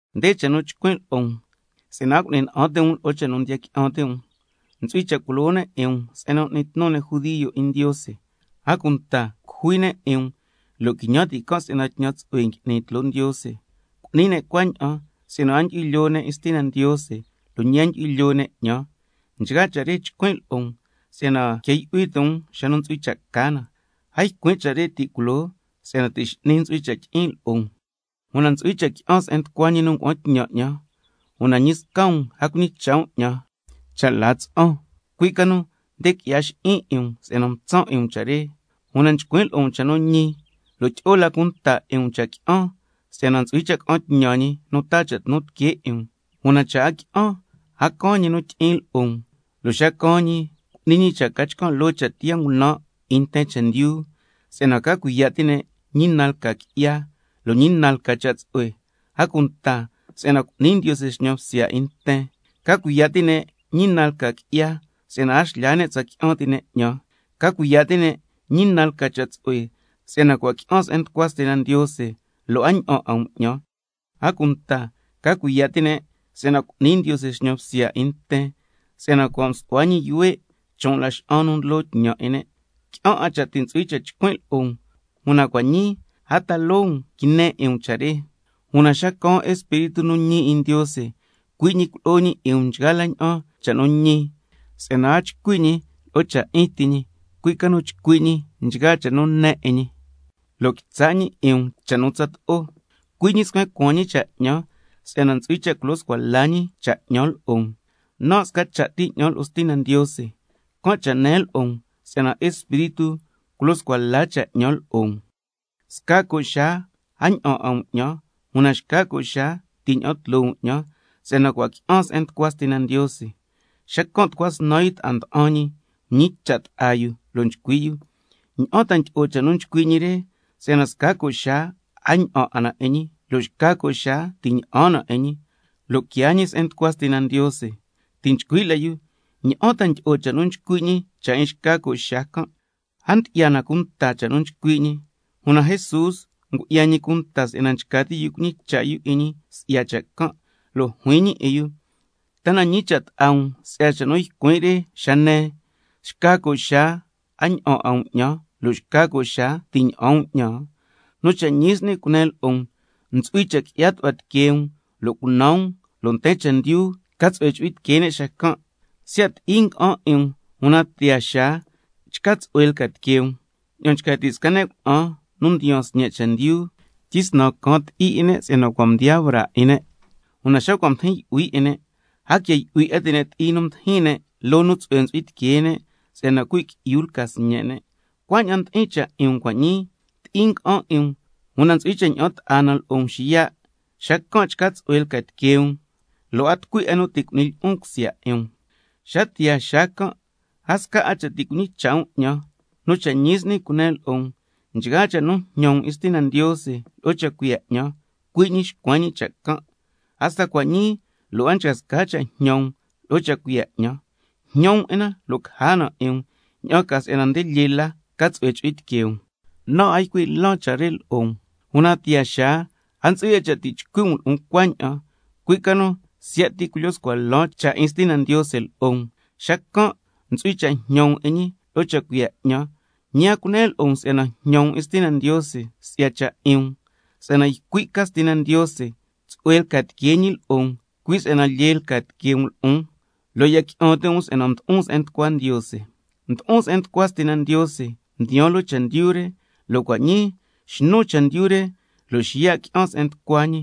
Nde cha' nu nchcuin' lo'o um si'yana a cu'ni na'an ti' um lo'o cha' nu ndiya qui'an ti' um. Ntsu'hui cha' culo ne' 'in um se'en ndiyo' ti'in ne' judio. A cunta ntsu'hui cha' cujui ne' 'in um, lo' quiñan ti' can' si'yana tñan tsu'hue ngui'ni tloo Ndiose. Cu'ni ne' cuaña'an si'yana a ndyu'hui lyoo ne' 'in Stina Ndiose, lo' ñi a ndyu'hui lyoo ne' 'ñan. Nchgaa cha' re nchcuin' lo'o um si'yana quia yu'hui ti' xa ntsu'hui cha' ca na. A ycuin' cha' re ti' culoo si'yana ti' x'ni ntsu'hui cha' tyi'in lo'o um. Una ntsu'hui cha' qui'an se'en nducua ñi nu ngua'an tñan 'ñan, una ñi sca um a ñicha' um 'ñan cha' la tsa'an. Cui' ca nu nde qui'ya xi'in 'in um si'yana mtsan' 'in um nchgaa cha' re. Una nchcuin' lo'o um cha' nu ñi, tyi'o la cunta 'in um cha' qui'an, si'yana ntsu'hui cha' ca'an tñan Ñi nu taa cha' tnu tiquee 'in um. Una cha' a qui'an, a caan ñi nu tyi'in lo'o um. Lo' xa caan ñi, cu'ni ñi cha' ca chcan' loo cha' tiyaa ngunan' 'in nten chendyu, si'yana ca cuiya' ti' ne' ñi na lca qui'ya, lo' ñi na lca cha' tsu'hue, a cunta si'yana Ndiose cu'ni ñi xñan bsya 'in nten. Ca cuiya' ti' ne' ñi na lca qui'ya, si'yana a xlyaa ne' tsa qui'an ti' ne' 'ñan. Ca cuiya' ti' ne' ñi na lca cha' tsu'hue, si'yana cua' qui'an se'en nducua Stina Ndiose, lo' a ña'an 'a um 'ñan. A cunta ca cuiya' ti' ne' si'yana Ndiose ntsu'hui cha' cu'ni ñi xñan bsya 'in nten, si'yana cua' msu'hua ñi yuhue' chon' laxa'an nu ndlo tñan 'in ne'. Qui'an 'a cha' ti' ntsu'hui cha' chcuin' lo'o um, una cua' ñii a ta loo um quine 'in um cha' re. Una xa caan Espíritu nu ñi 'in Ndiose, cui' ñi culo'o ñi 'in um nchgaa la ña'an cha' nu ñi, si'yana a chcui' ñi lo'o cha' 'in ti ñi, cui' ca nu chcui' ñi nchgaa cha' nu ne 'in ñi, lo' quitsa' ñi 'in um cha' nu tsato'o. Cui' ñi scuen cuaan ñi cha' 'ñan si'yana ntsu'hui cha' culyo scua la ñi cha' 'ñan lo'o um. Nan' sca cha' ti 'ñan lo'o Stina Ndiose, can' cha' nen lo'o um si'yana Espíritu ntsu'hui cha' culyo scua la cha' 'ñan lo'o um. Sca co' xaa a ña'an 'a um 'ñan, una xca co' xaa ti' ña'an tloo um 'ñan, si'yana cua' qui'an se'en nducua Stina Ndiose. Xacan' tucua snan yu ta'a nda'an ñi mñicha' ta'a yu lo' nchcui' yu: ¿Ña'an ta ndyi'o cha' nu nchcui' ñi re, si'yana sca co' xaa a ña'an 'a na 'in ñi, lo' xca co' xaa ti' ña'an na 'in ñi, lo' quiaa ñi se'en nducua Stina Ndiose? Ti' nchcui' la yu: ¿Ña'an ta ndyi'o cha' nu ycui' ñi cha' 'in xca co' xaa can'? A ndyi'ya na cunta cha' nu nchcui' ñi. Una Jesús ngu'ya ñi cunta si'yana nchca ti' yu cuñicha' yu 'in ñi si'ya cha' can', lo' juin ñi 'in yu: ¿Ta na ñicha' ta'a um si'ya cha' nu ycuin' re xa nen: Sca co' xaa a ña'an 'a um 'ñan, lo' xca co' xaa ti' ña'an um 'ñan? Nu cha' ñi s'ni cunen lo'o um, ntsu'hui cha' qui'ya tu'hua tiquee um lo' cunan um, lo' nten chendyu ca tsu'hue chu'hui tiquee ne' xacan'. Siya' ti'i nga'an 'in um, una tiyaa xaa chca tsu'hue lca tiquee um. Ña'an nchca ti' sca ne' cuna'an nu ndiyaan sñe' chendyu, tyisnan caan ti'i 'in ne' si'yana cua' mdiyaa braa 'in ne', una xa cua' mdijin yu'hui 'in ne', a quia yu'hui 'a ti' ne' ti'i nu mdijin ne' loo nu tsu'hue ntsu'hui tiquee ne' si'yana cuhui' qui'yu lca sñe' ne'. Cuaña'an ndi'in cha' 'in um cua' ñii, ti'i nga'an 'in um, una ntsu'hui cha' ña'an ta'a na lo'o um xiya', xacan' chca tsu'hue lca tiquee um, lo' a tucui 'a nu ti' cu'ni lyi'un cusya 'in um. Xa tiyaa tsaan can' a sca 'a cha' ti' cuñicha' um 'ñan. Nu cha' ñi s'ni cunen lo'o um, nchgaa cha' nu jñan um 'in Stina Ndiose lo'o cha' cuiya' 'ñan, cui' ñi xcuen ñi cha' can'. Hasta cua' ñii lo' a nchca sca cha' jñan um lo'o cha' cuiya' 'ñan. Jñan um 'in na lo' caja na 'in um, ña'an ca si'yana nde lyee la ca tsu'hue chu'hui tiquee um. Nan' a ycui' lan cha' re lo'o um, una tiyaa xaa a ntsu'hui 'a cha' ti' chcuin' lo'o um cuaña'an, cui' ca nu siya' ti culyo scua lan cha' 'in Stina Ndiose lo'o um. Xacan' ntsu'hui cha' jñan um 'in ñi lo'o cha' cuiya' 'ñan, ñi a cunen lo'o um si'yana ti' jñan 'in Stina Ndiose si'ya cha' 'in um, si'yana ycui' ca Stina Ndiose tsu'hue lca tiquee ñi lo'o um, cui' si'yana lyee lca tiquee um lo'on, lo' ya qui'an ti' um si'yana mdo'on se'en nducua Ndiose. Mdo'on se'en nducua Stina Ndiose, mdiyaan loo chendyu re, lo' cua' ñii xnun chendyu re, lo' xiya' qui'an se'en nducua ñi.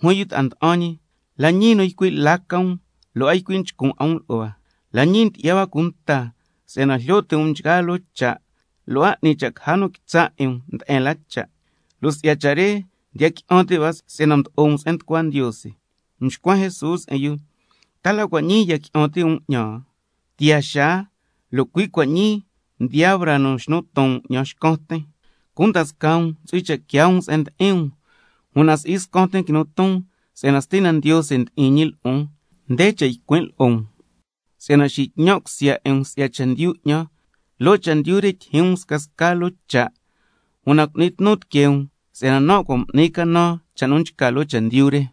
Juin yu ta'a nda'an ñi: La ñii ycui' la ca um, lo' a ycui' nchcun 'a um lo'o hua. La ñii ndyi'ya hua cunta si'yana jlyo ti' um nchgaa loo cha', lo' a 'ni cha' ti' caja nu quitsa' 'in um nde'en la cha', si'ya cha' re ndiya qui'an ti' hua si'yana mdo'o um se'en nducua Ndiose. Mxcuen Jesús 'in yu: ¿Ta la cua' ñii ndiya qui'an ti' um 'ñan? Tiyaa xaa, lo' cui' cua' ñii mdiyaa braa nu xnu ton um 'ñan xcan tin, cunda scaa um ntsu'hui cha' quiaa um se'en ndi'in um. Una si'i xcan tin quinun ton si'yana Stina Ndiose ndi'in ñi lo'on. Nde cha' ycuin' lo'o um si'yana tsatlyu tyi'in tsu'hue na. Loo chendyu re ntsu'hui cha' tyijyin um scasca loo cha', una cu'ni tnu tiquee um si'yana nan' cua' m'nin canan cha' nu nchca loo chendyu re.